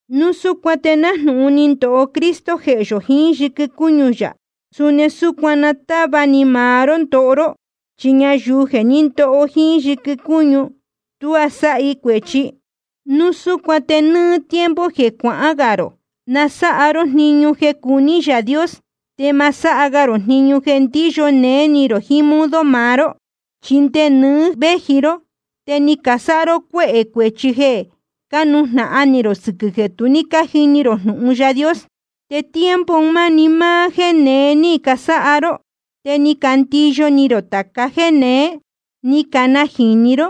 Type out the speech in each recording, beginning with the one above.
Núu súcuan te nájnūhun ni ndoho Cristo jehē yō jiín yɨquɨ cúñu yā, suni súcuan na táva ni maá ró ndoho ró. Chi ñayuu jeē ní ndoho jíín yɨquɨ cúñu, tuá sáha i cuēchi. Núu súcuan te nɨ́ɨ́ tiempo jeē cuahán gā rō, na sáha ró jniñu jeē cuní Yaā Dios, te ma sáha ga rō jniñu jeē ndíyo néé ni rō jiín modo maá ró. Chi nde nɨɨ́ véji ró, te ni casáha ró cuéhē cuēchi jeē cánujnahan ni rō sɨquɨ̄ jeē tu ní cájini rō jnūhun Yaā Dios. Te tiempo un máni máá jéē neé ni casáha ró, te ni candiyo ni rō tāca jéē neé, ni canajīni ró,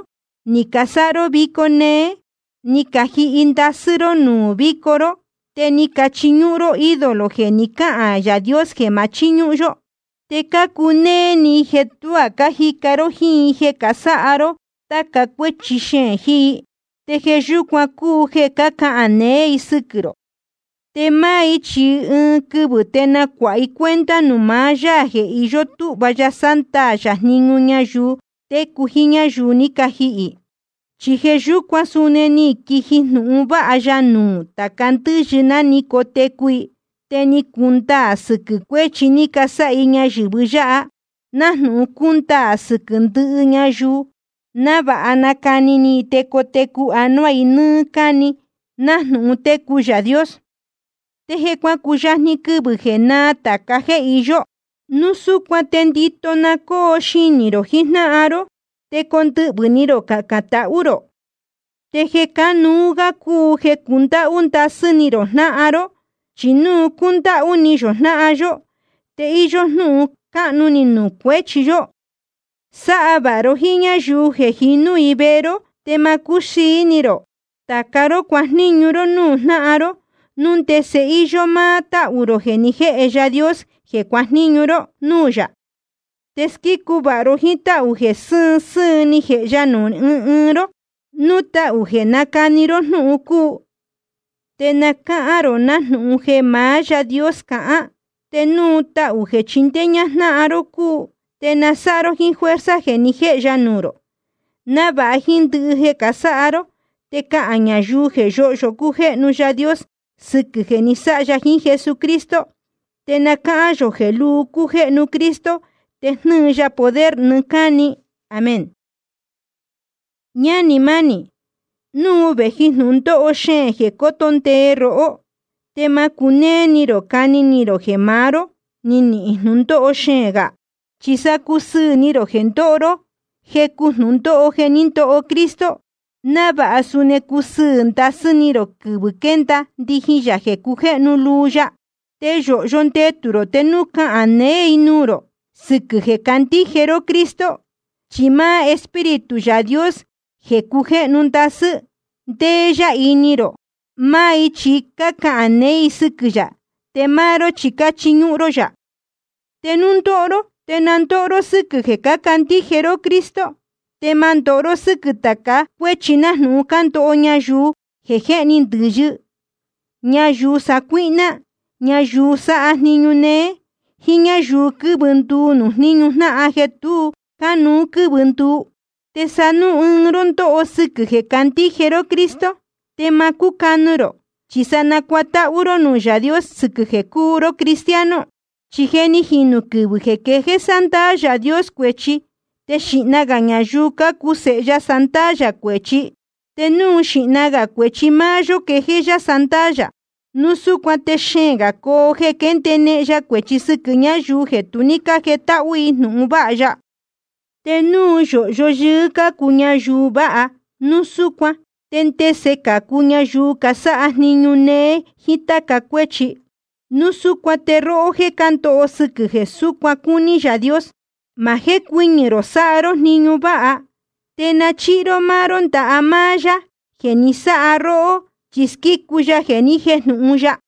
ni casáha ró vico néé, ni cajihi ndasɨ́ ró nuū víco ró, te ni cachiñúhún ró ídolo jeē ni cáhān Yaā Dios jeē ma chíñúhún yó. Te cácunéé ni i jeē tuá cájica ró jíín i jeē sáha ró táca cuéchi xeēn jiín i. Te jeē yúcuan cúu jeē cácahān neé i sɨquɨ̄ rō. Te máá i chi ɨɨn quɨvɨ̄ te nacuāha i cuenta nuū maá Yaā jeē iyó túhva ya sándaā yā jniñu ñayuu técu jiín ñáyuu ní cajihī. Chi jeē yúcuan suni ni quiji jnūhun vāha ya nuū tāca ndɨ́yɨ ná ni cotecu i. Te ni cundaā sɨquɨ̄ cuéchi ni casáha i ñayɨ̄vɨ yáha, nájnūhun cúndaā sɨquɨ̄ ndɨhɨ ñayuu, návāha nacani ni i te cotecu anuá i nɨ́ɨ́ cáni nájnūhun técu Yaā Dios. Te je cuacuyajni quɨvɨ̄ jeē náā tāca jéē iyó. Núu súcuan te ndito na cóo xinī rō jijnáhan ró, te condɨhvɨ̄ ni rō cacān tahú rō. Te jeē cánuú gá cúu jeē cundáhú ndasɨ́ ni rō jnáhan ró. Chi núu cundáhú ni yō jnáhan yó, te íyó jnúhun cáhnu ni nuū cuehē cuēchi. Sáha vāha ró jíín ñáyuu jeē jinú i vehe ró, te ma cúxīi ni rō. Tāca ró cuajníñu ró núū jnáhan ró, núu ndese íyó máá táhū rō jeē ni jéhe Yaā Dios jeē cuajníñu ró núū yā. Te squícu vāha ró jíín táhū jeē sɨ́ɨn sɨ́ɨn ni jēhe ya nuū ɨɨn ɨɨn ró. Núu tahū jeē nácani ró jnúhun cúu, te na cáhán rō nájnūhun jeē maá Yaā Dios cahán. Te núu tahū jeē chindéé ñáhán ró jnáhan ró cúu, te na sáha ró jíín fuerza jeē ni jéhe ya nuū rō, návāha jíín ndɨhɨ jeē casáha ró te cahān ñayuu jeē yóhyo cújéhnu Yaā Dios sɨquɨ̄ jeē ni sáha ya jiín Jesucristo. Te na cáhán yō jeē luu cújéhnu Cristo te jnɨ́ɨ ya poder nɨɨ́ cáni. Amén. Ñánī mánī, núu vēji jnūndóho xeēn jeē coto ndee rohó, te ma cunéé ni rō cani ni rō jeē maá ró ni nihīn jnūndóho xeēn gā. Chi sa cusɨɨ̄ ni rō jeē cándoho ró jecu jnūndóho jeē ní ndoho Cristo, návāha suni cusɨɨ̄ ndasɨ́ ni rō quɨvɨ̄ quénda ndijin yā jeē cujéhnu luu ya. Te yōhyo ndetū rō te núu cácahān neé i nuū rō sɨquɨ̄ jeē cácandíje ró Cristo. Chi máá Espíritu Yaā Dios jeē cujéhnu ndasɨ́, ndéé yá ini rō. Máá i chi cácahān neé i sɨquɨ̄ yā, te máá ró chi cáchiñúhún ró yā. Te núu ndoho ró, te na ndóho ró sɨ́quɨ̄ jeē cácandíje ró Cristo. Te ma ndóho ró sɨ́quɨ̄ tāca cuéchi nájnūhun cándoho ñayuu jéhni ndɨ̄yɨ, ñayuu sacuíhná, ñayuu sáha jniñu néé, jíín ñáyuu quɨ́vɨ nduu nuū jníñu jnáhan jeē tu cánuú quɨ́vɨ nduu. Te sa núu ɨɨn ró ndóho sɨquɨ̄ jeē candíje ró Cristo, te ma cúcanu rō, chi sa nacuatáhú ró nuū Yaā Dios sɨquɨ̄ jeē cúu ró cristiano. Chi je ni jinū quɨvɨ̄ jeē quejéé sándaā Yaā Dios cuēchi, te xīhna gā ñayuu cácuu sēhe ya sándaā yā cuēchi. Te núu xīhna gā cuēchi máá yó quejéé yá sándaā yā, núu súcuan te xeēn gā coo jeē ndénehen ya cuēchi sɨquɨ̄ ñáyuu jeē tu ní jétáhú jnúhun vāha ya. Te núu yōhyo yɨɨ́ cácu ñayuu vāha, núu súcuan ¿te ndese cācu ñayuu casáha jniñu néé jíín táca cuéchi? Núu súcuan te róhó jéē cándoho sɨquɨ̄ jeē súcuan cúní Yaā Dios, ma jécuɨñɨ̄ rō sáha ró jniñu váha, te na chíhi ró máá ró ndaha máá Yaā jeē ni sáha róhó, chi squícu ya jeē ni jéjnūhun ya.